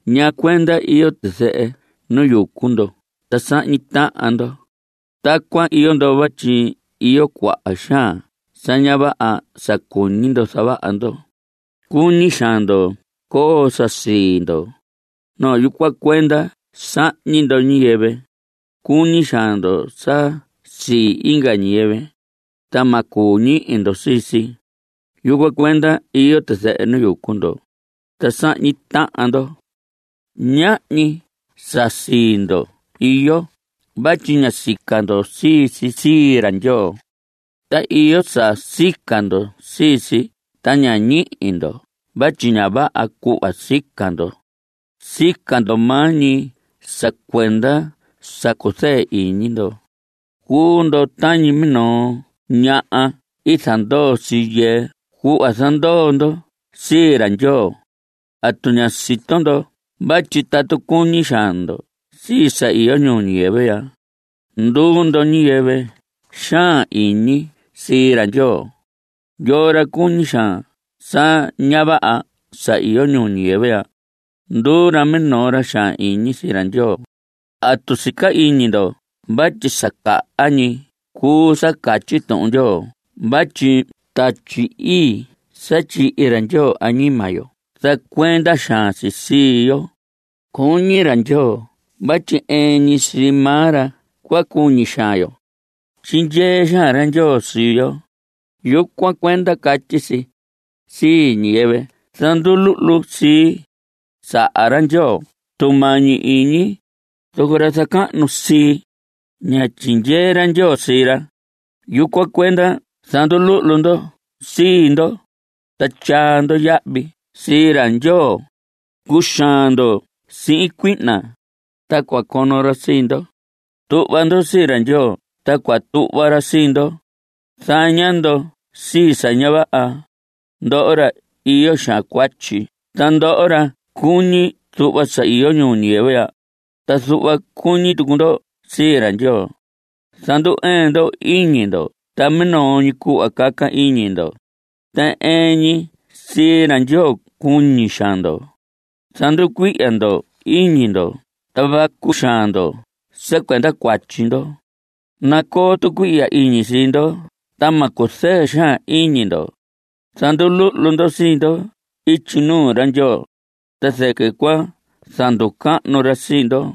¿Ñaa cuenda iyo tizɨhɨ nu yucu ndo ta sahñi tahan ndo? Tacuan iyo ndo vatyi iyo cuaha xaan sa ña vaha sa cuñi ndo zavaha ndo. Cuñi xaan ndo coo sa sii ndo. Yucuan cuenda sahñi ndo ñiyɨvɨ. Cuñi xaan ndo sa sii inga ñiyɨvɨ, ta ma cuu ñihi ndo sii si. Yucuan cuenda iyo tizɨhɨ nu yucu ndo, ta sahñi tahan ndo. Ñahñi sa sii ndo iyo vatyi ña sica ndo sii si sii ra Ndyoo. Ta iyo saha sica ndo sii si ta ña ñihi ndo vatyi ña vaha cuhva sica ndo. Sica ndo maa ñi sa cuenda sa cuzɨɨ iñi ndo. Cuu ndo tañi minoo ñaha i zandoo sii yɨɨ cuhva zandoo ndo sii ra Ndyoo. ¿Atu ña sito ndo vatyi tatu cuñi xaan ndo sii sa iyo ñuu ñiyɨvɨ ya, nduu ndo ñiyɨvɨ xaan iñi sii ra Ndyoo? Yoo ra cuñi xaan sa ña vaha sa iyo ñuu ñiyɨvɨ ya, nduu ra minoo ra xaan iñi sii ra Ndyoo. ¿Atu sica iñi ndo vatyi sa caha ñi cuu sa catyi Tuhun Ndyoo vatyi Tatyi Ii sa tyihi ra Ndyoo añima yo zacuenda xaan si sii yo? Cuñi ra Ndyoo vatyi ɨɨn ñi sii maa ra cua cuñi xaan yo. Tyindyee xaan ra Ndyoo sii yo. Yucuan cuenda catyi si: “Sii ñiyɨvɨ zanduluhlu sii, saha ra Ndyoo tumañi iñi. Zoco ra zacahnu sii, ña tyindyee ra Ndyoo sii ra.” Yucuan cuenda zanduluhlu ndo sii ndo, ta tyaa ndo yahvi sii ra Ndyoo. Cuxaan ndo sihin cuihna, ta cua cono ra sii ndo. Tuhva ndo sii ra Ndyoo, ta cua tuhva ra sii ndo. Zaña ndo sii sa ña vaha, ndoho ra iyo xaan cuatyi. Ta ndoho ra cuñi zuhva sa iyo ñuu ñiyɨvɨ ya, ta zuhva cuñi tucu ndo sii ra Ndyoo, zandu‑ɨɨn ndo iñi ndo ta minoo ñi cuhva caca iñi ndo, ta ɨɨn ñi sii ra Ndyoo cuñi xaan ndo. Zanducuihya ndo iñi ndo ta vacu xaan ndo sa cuenda cuatyi ndo. Nacoo tucuihya iñi sii ndo ta ma cuzɨɨ xaan iñi ndo. Zanduluhlu ndo sii ndo ityi nuu ra Ndyoo, ta zɨquɨ cua zanducahnu ra sii ndo.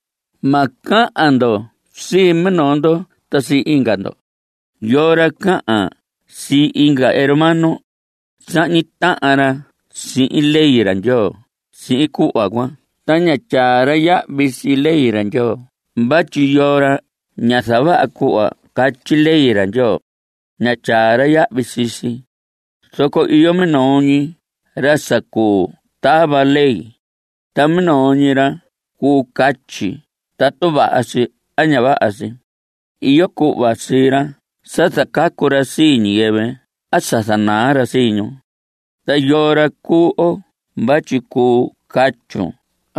Ma cahan ndo sii minoo ndo ta sii inga ndo. Yoo ra cahan sii inga hermano, sahñi tahan ra sihin ley ra Ndyoo sihin cuhva cuan ta ña tyaa ra yahvi sii ley ra Ndyoo vatyi yoo ra ña zavaha cuhva catyi ley ra Ndyoo, ña tyaa ra yahvi sii si. Zoco iyo minoo ñi ra sa cuu tava ley, ta minoo ñi ra cuu catyi tatu vaha si a ña vaha si. Iyo cuhva sii ra sa zacacu ra sii ñiyɨvɨ a sa zanaa ra sii ñu. ¿Ta yoo ra cuu oo vatyi cuu catyun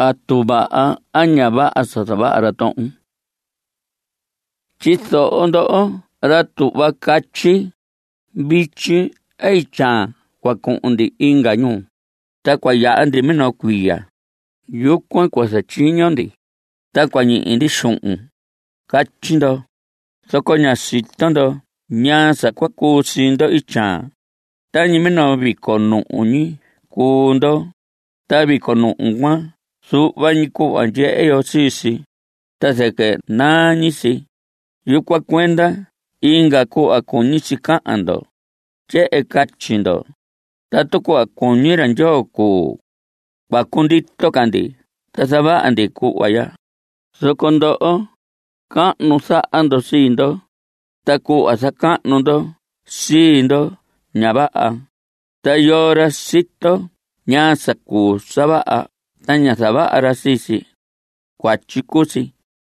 atu vaha a ña vaha sa zavaha ra tohon? Tyizoho ndoho ra tuhva catyi: “Vityi a ityaan cua cuhun ndi inga ñuu, ta cua yaha ndi minoo cuiya. Yucuan cua zatyiño ndi, ta cua ñihi ndi xuhun.” Catyi ndo. Zoco ña sito ndo ñaa sa cua cuu sii ndo ityaan. Tañi minoo vico nuhu ñi cuu ndo. Ta vico nuhu cuan zuhva ñi cuhva ndyehe yo sii si, ta zɨquɨ naa ñi si. Yucuan cuenda inga cuhva cuñi si cahan ndo. Tyehen catyi ndo: “Tatu cuhva cuñi ra Ndyoo cuu, cua cundito ca ndi ta zavaha ndi cuhva ya.” Zoco ndoho, cahnu zaha ndo sii ndo. Ta cuhva zacahnu ndo sii ndo, ña vaha. Ta yoo ra sito ñaa sa cuu sa vaha ta ña zavaha ra sii si, cuatyi cuu si.